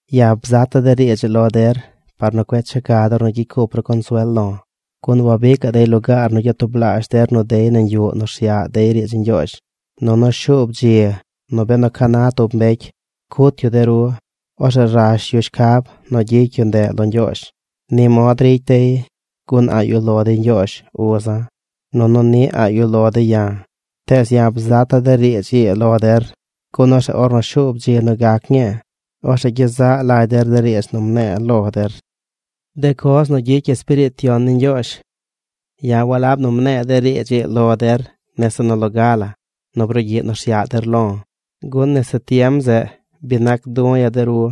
’Ya̱ bzata̱ de riidz ii lo der par nu cueꞌ checa der nu gyicy cup ru consuel lo̱. Gun wabicaꞌ dey lugaar nu gyatublaazh der nu dey nañ yuꞌ nu rsyaꞌ dey riidz ni Ñgyoozh. Nunu shuub dzi nu benu ca na tub mbecy cut yu de ru, orzeꞌ rash yu shcab nu gyicy yu ndeꞌ lo Ñgyoozh. Ni mod ricy dey gun a̱ꞌ yuꞌ lo dey Ñgyoozh uza̱ nunu niꞌ a̱ꞌ yuꞌ lo dey ya̱. Tees ya̱ bzata̱ de riidz ii lo der gun orzeꞌ ornu shuub dzi nu gac ñii, orzeꞌ gyezaꞌ lagy der de riidz nu mne̱e̱ lo der. De coz nu gyicy Espiriit Yon ni Ñgyoozh ’Ya̱ walab nu mne̱e̱ de riidz ii lo der nese nu loga la nu brugyiꞌ nu rsyaꞌ der lo̱, gun nese tiem zeꞌ bi nac du̱ ya̱ de ru.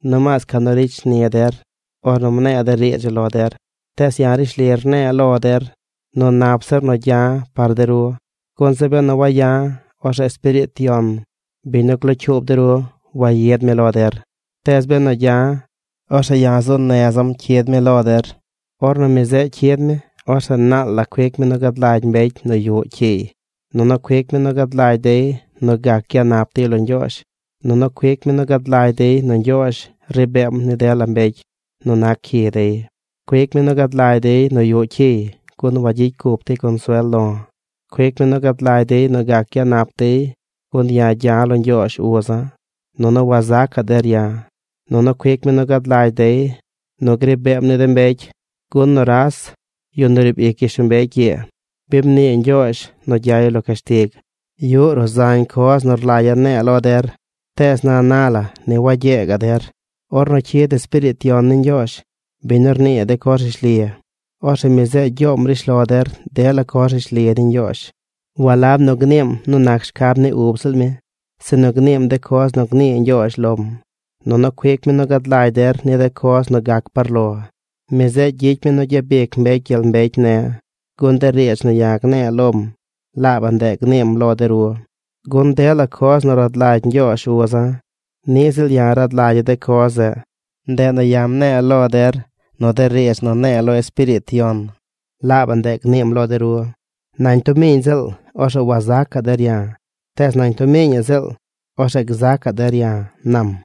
Nomaas ca nu ricy shni der ornu mne̱e̱ de riidz ii lo der. Tees ya̱ rishli rne̱e̱ lo der nu nap zir nu gya̱ par de ru, gun zeꞌ benu waya̱, orzeꞌ Espiriit Yon, biñ nu glocyuub de ru, wayid mi lo der. Tees benu gya̱, orzeꞌ ya̱ zuu neza̱m cyid mi lo der. Ornu mi zeꞌ cyid mi, orzeꞌ naal la cuic mi nu gad lagy mbecy nu yuꞌ cyiy, nunu cuic mi nu gad lagy dey nu gac gyanap dey lo Ñgyoozh, nunu cuic mi nu gad lagy dey nu Ñgyoozh ri beem ni dela mbecy nu nac cyi dey. Cuic mi nu gad lagy dey nu yuꞌ cyiy gun wagyicy cup dey consuel lo̱. Cuic mi nu gad lagy dey nu gac gyanap dey gun ya̱ gya̱ lo Ñgyoozh uza̱, nunu wazacaꞌ der ya̱. Nunu cuic mi nu gad lagy dey nu gri beem ni de mbecy gun nuras, yu nu riib ic gyishlombecy ii, bi mnii Ñgyoozh nu gyay lo cashtig. ’Yuꞌ ruꞌ zañ coz nu rlagya̱ ne̱e̱ lo der, tees na na la ni wagyee gaꞌ der. Ornu cyid Espiriit Yon ni Ñgyoozh, biñ nu rnii de coz rishli, orzeꞌ mi zeꞌ gyoom rishlo der dela coz rishli ni Ñgyoozh. Walab nu gniim nu nac shcab ni ub ziꞌl mi, sinu gniim de coz nu gnii Ñgyoozh lom. Nunu cuic mi nu gad lagy der ni de coz nu gac par lo. Mi zeꞌ gyicy mi nu gyabic mbecy gyel mbecy ne̱, gun de riidz nu ya̱ gne̱e̱ lom, laabaꞌ ndeꞌ gniim lo de ru. Gun dela coz nu rad lagy Ñgyoozh uza̱, niꞌ ziꞌl ya̱ rad lagya̱ de coz zeꞌ. Ndeꞌ nu ya̱ mne̱e̱ lo der nu de riidz nu ne̱e̱ lo Espiriit Yon, laabaꞌ ndeꞌ gniim lo de ru. ’Nañ tub miiñ ziꞌl, orzeꞌ wazacaꞌ der ya̱. Tees nañ tub miiñaꞌ ziꞌl, orzeꞌ gzacaꞌ der ya̱ ―nam.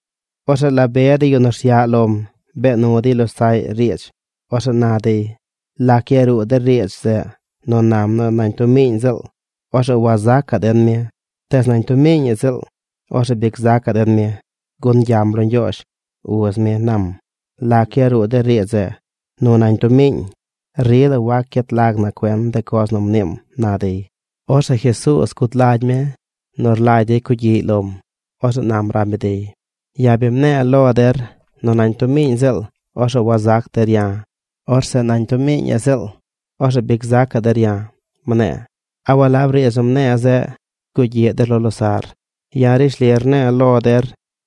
Orzeꞌ la be de yu nu rsyaꞌ lom bee nu dey losaꞌy riidz. Orzeꞌ na dey: ―¿Lac yaruu de riidz zeꞌ nu nam nu nañ tub miiñ ziꞌl, orzeꞌ wazacaꞌ den mi; tees nañ tub miiñaꞌ ziꞌl, orzeꞌ bi gzacaꞌ den mi, gun gyam lo Ñgyoozh, uz mi, nam? ¿Lac yaruu de riidz zeꞌ nu nañ tub miiñ? Rila wac gyet lag na cuen de coz nu mniim ―na dey. Orzeꞌ Jesuuz guud lagy mi nu rlagy dey cugyiꞌy lom. Orzeꞌ nam rab mi dey: ―Ya̱ bi mne̱e̱ lo der nu nañ tub miiñ ziꞌl orzeꞌ wazac der ya̱. Orzeꞌ nañ tub miiñaꞌ ziꞌl, orzeꞌ bi gzacaꞌ der ya̱, mne̱e̱. ¿A walab riidz nu mne̱e̱ zeꞌ, rgugyiꞌ der lo losaꞌr? Ya̱ rishli rne̱e̱ lo der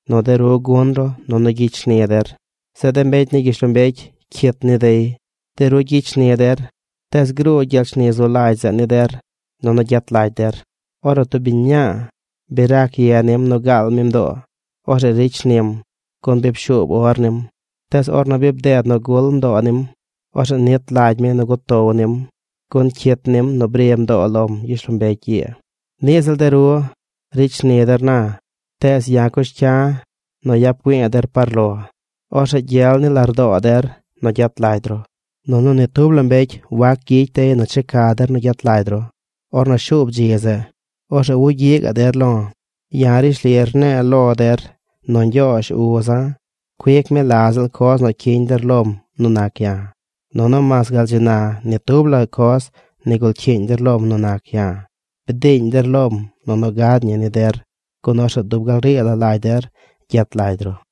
nu de ru gun ru nunu gyicy shni der. Zeꞌ de mbecy ni gyishlombecy cyit ni dey. De ru gyicy shni der tees gruu gyel shni zu lagy zeꞌ ni der nunu gyet lagy der. Ornu tub biñ mñaa bi rac ye nim nu gaal mi mdoo, orzeꞌ ricy shnim gun bi pshuub or nim. Tees ornu bi bded nu gul mdoo nim, orzeꞌ nit lagy mi nu gutow nim gun cyit nim nu bri mdoo lom gyishlombecy ii. Niꞌ ziꞌl de ru. Ricy shni der na. Tees ya̱ cush cya̱ nu yap güi̱i̱ der par lo. Orzeꞌ gyel ni lardoo der nu gyet lagy ru. Nunu ni tub la mbecy wacgyicy dey nu checa der nu gyet lagy ru. Ornu shuub dzi zeꞌ, orzeꞌ wugyiꞌ gaꞌ der lo̱. ’Ya̱ rishli rne̱e̱ lo der nu Ñgyoozh, uza̱, cuic mi la ziꞌl coz nu cyiñ der lom nu nac ya̱. Nunu mas gal dzi na ni tub la coz nigul cyiiñ der lom nu nac ya̱. Bdiiñ der lom nunu gad ñi ni der gun orzeꞌ dub gal rii la lagy der gyet lagy ru.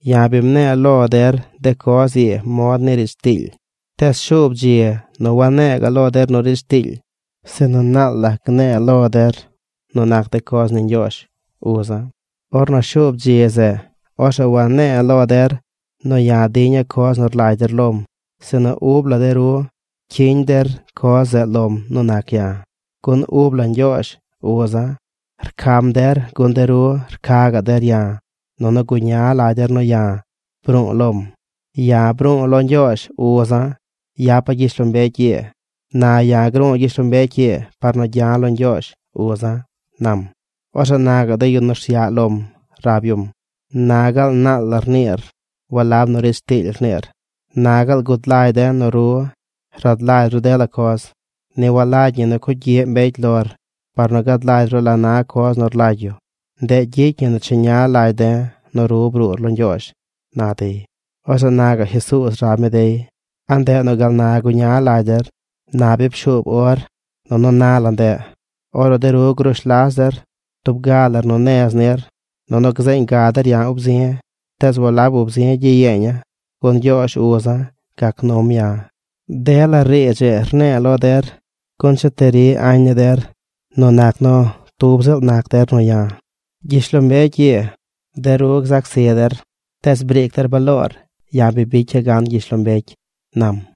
’Ya̱ bi mne̱e̱ lo der de coz ii mod ni riidz tiily. Tees shuub dzi nu wane̱e̱ ga̱ꞌ lo der nu riidz tiily, sinu naal la gne̱e̱ lo der nu nac de coz ni Ñgyoozh, uza̱. Ornu shuub dzi zeꞌ, orzeꞌ wane̱e̱ lo der nu ya̱ diña̱ coz nu rlagy der lom, sinu ub la de ru cyiñ der coz zeꞌ lom nu nac ya̱, gun ub la Ñgyoozh, uza̱, rcam der. Rcam der gun de ru rca gaꞌ der ya̱ nunu guña lagy der nu ya̱ bru̱u̱ lom. Ya̱ bru̱u̱ lo Ñgyoozh, uza̱, yapa̱ gyishlombecy ii. Na ya̱ gru̱u̱ gyishlombecy ii par nu gya̱ lo Ñgyoozh, uza̱ ―nam. Orzeꞌ na gaꞌ de yu nu rsyaꞌ lom rab yum: ―Na gaal naal la rniir. Walab nu riidz tiily rniir. Na gaal gud lagy de̱ nu ru rad lagy ru dela coz. Ni walagy ñi nu cugyiꞌ mbecy lor par nu gad lagy ru la na coz nu rlagy yu. Ndeꞌ gyicy ñi nu cheña lagy de̱ nu ru bruur lo Ñgyoozh ―na dey. Orzeꞌ na gaꞌ Jesuuz rab mi dey: ―¿A ndeꞌ nu gal na guña lagy der? Na bi pshuub or, nunu na la ndeꞌ, ornu de ru grush las der tub ga lar nu nez nir. Nunu gzeeñ ga der ya̱ ub zi̱. Tees walab ub zi gyiyeeña̱ gun Ñgyoozh, uza̱, gac num ya̱. De la riidz ii rne̱e̱ lo der gun cheti ri añ ni der nu nac nu tub ziꞌl nac der nu ya̱. Gyishlombecy ii, de ru gzac zi der. Tees briic der baloor. Ya̱ bi bicya̱ gan gyishlombecy ―nam.